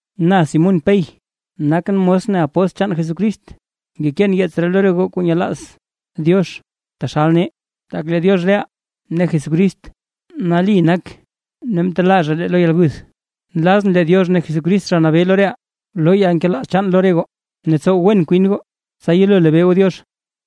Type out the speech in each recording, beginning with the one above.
Na Simún Pey, nakʼn mos ne apóstl chaan Jesucrist. Ngekeen yeets ree lo re goo kuu nyelaaz Diox taxalka nee. Tak lee Diox reʼaa ne Jesucrist nali nak zha ne mtelaa zha lee lo yalguth. Nlazʼn lee Diox ne Jesucrist Zha Nabee lo reʼaa, loo yalnkelaaz chaan lo re goo ne tsow wen kwin goo, tsa yelo lebee goo Diox.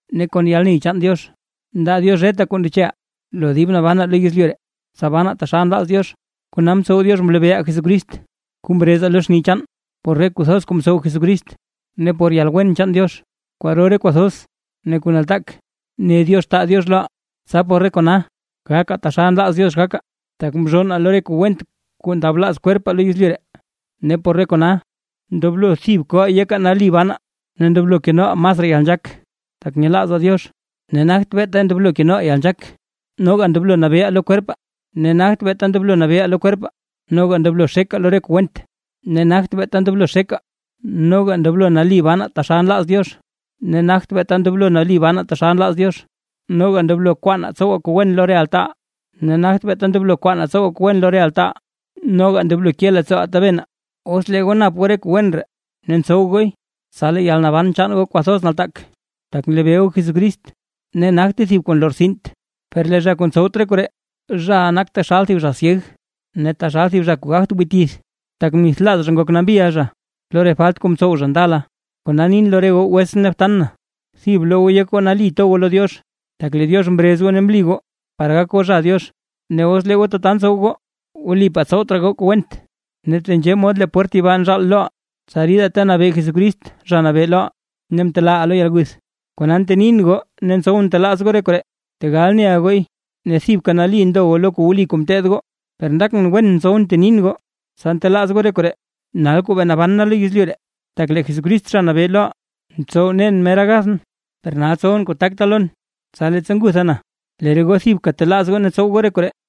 Ne kon yalney chaan Diox ndaa Diox reta kuu ndecheʼaa lo dib nabanaa lo yezlyu ree, tsa banaa taxal nlaaz Diox, kona mtsow Diox mlebeeʼaa Jesucrist kuu mrezaa lo xni chaan, por re kuu thoz kuu mtsow Jesucrist. Ne por yalwen chaan Diox kwaro re kuu thoz ne kuu nataak ne Diox taa Diox loʼaa, tsa por re kona gakaa taxal nlaaz Diox gakaa, tak mzhonnaa lo re kuu went kuu ndablaaz kwerpaa lo yezlyu ree. Ne por re kona; ndoblo thib koʼaa yekaa nali banaa, ne ndoblo kenoʼaa masraa yalnzhaak tak nyelaazaa Diox. Ne nagt beeta ndoblo kenoʼaa yalnzhaak, noga ndoblo nabeeʼaa lo kwerpaa; ne nagt beeta ndoblo nabeeʼaa lo kwerpaa; noga ndoblo xekaa lo reta kuu went; ne nagt beeta ndoblo xekaa, noga ndoblo nali banaa taxal nlaaz Diox; ne nagt beeta ndoblo nali banaa taxal nlaaz Diox, noga ndoblo kwaanaa tsowaa kuu wen lo re altaaʼaa; ne nagt beeta ndoblo kwaanaa tsowaa kuu wen lo re altaaʼaa, noga ndoblo ke leettsooʼaa tabenaa. Os lee goo nap goo re kuu wen ree ne ntsow gooy, tsa lee yalnaban chaan goo kwathoz nataak, tak nlebee goo Jesucrist ne nagte thib kuu nlortsint. Per lee zha kuu ntsowt re koree, zhaʼa nak taxal thib zha syeg ne taxal thib zha kuu gagt wii tith; tak mnithlaaz zha ngok nambiʼa zha lo re falt kuu mtsow zha ndala. Kona nin lo re goo wetsʼn ne btan na, thib bloo goo yek goo nali to goo lo Diox, tak lee Diox mrez goo ne mli goo par gak goo zha Diox, ne os lee goo tata ntsow goo, wlipaa tsowt raa goo kuu went. Ne tenzhee mod lee pwert yibaa nzhaal loʼaa, tsa ridaa ta nabee Jesucrist Zha Nabee loʼaa ne mtelaaʼaa lo yalguth. Kona, ntenin goo ne ntsowʼn ntelaaz goo re koree, tegal neʼa gooy, ne thibka nali ndo goo lo kuu wli kuu mteed goo. Per ndakʼn wen ntsowʼn ntenin goo, tsa ntelaaz goo re koree, nal kuu bee naban na lo yezlyu ree. Tak lee Jesucrist Zha Nabee loʼaa, mtsow nen mera gathʼn. Per nal tsowʼn kuu takta lon, tsa leettsa ngutha na, lee re goo thibka telaaz goo ne tsow goo re koree.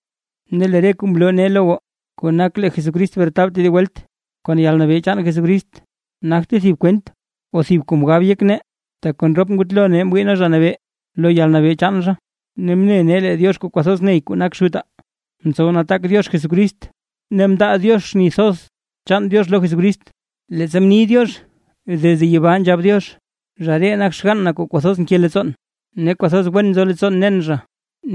Ne lee re kuu mloo nee lo goo, kuu nak lee Jesucrist bretab tedib welt kon yalnabee chaan Jesucrist, nagte thib kwent o thib kuu mgab yek nee, tak kon rop ngutlo nee mwii nee Zha Nabee lo yalnabee chaan zha. Ne mne nee lee Diox kuu kwathoz ney kuu nak Xutaa, mtsow nataak Diox Jesucrist ne mndaa Diox xni thoz chaan Diox lo Jesucrist, leettsa mni Diox desde yibaa nzhab Diox: “Zha ree nak xgann na kuu kwathoz nke leettsoon, ne kwathoz wen nzo leettsoon nen zha”.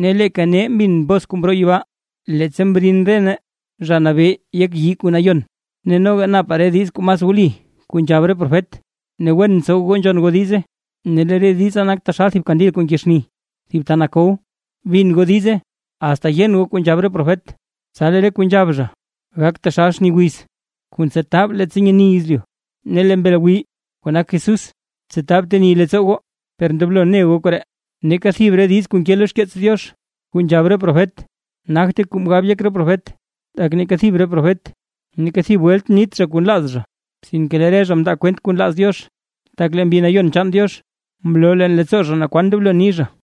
Ne leeka nee mbin bos kuu mroo yibaa, leettsa mrin re nee Zha Nabee yek yii kuu nayon. Ne noga napaa re diiz kuu mas wli kuu nzhab re profet, ne wen ntsow goo nzhon goo diize. Ne lee re diza nak taxal thib kandil kuu nkee xni thib ta nakow, bin goo diize asta yen goo re kuu nzhab re profet, tsa lee re kuu nzhab zha gak taxal xni wiz kuu ntsetab leettsa nyeni yezlyu, ne lee Mbel Gwii, kuu nak Jesús, tsetab teni leettsoo goo. Per ndoblo ne goo koree; neeka thib re diiz kuu nke lo xkeets Diox kuu nzhab re profet, nagte kuu mgab yek re profet, tak neeka thib re profet, neeka thib welt mnit zha kuu nlaaz zha. Sinke lee re zha mndaa zha kwent kuu nlaaz Diox, tak lee Mbi Nayon chaan Diox mloo leen leettsoo zha naa kwan ndoblo ni zha.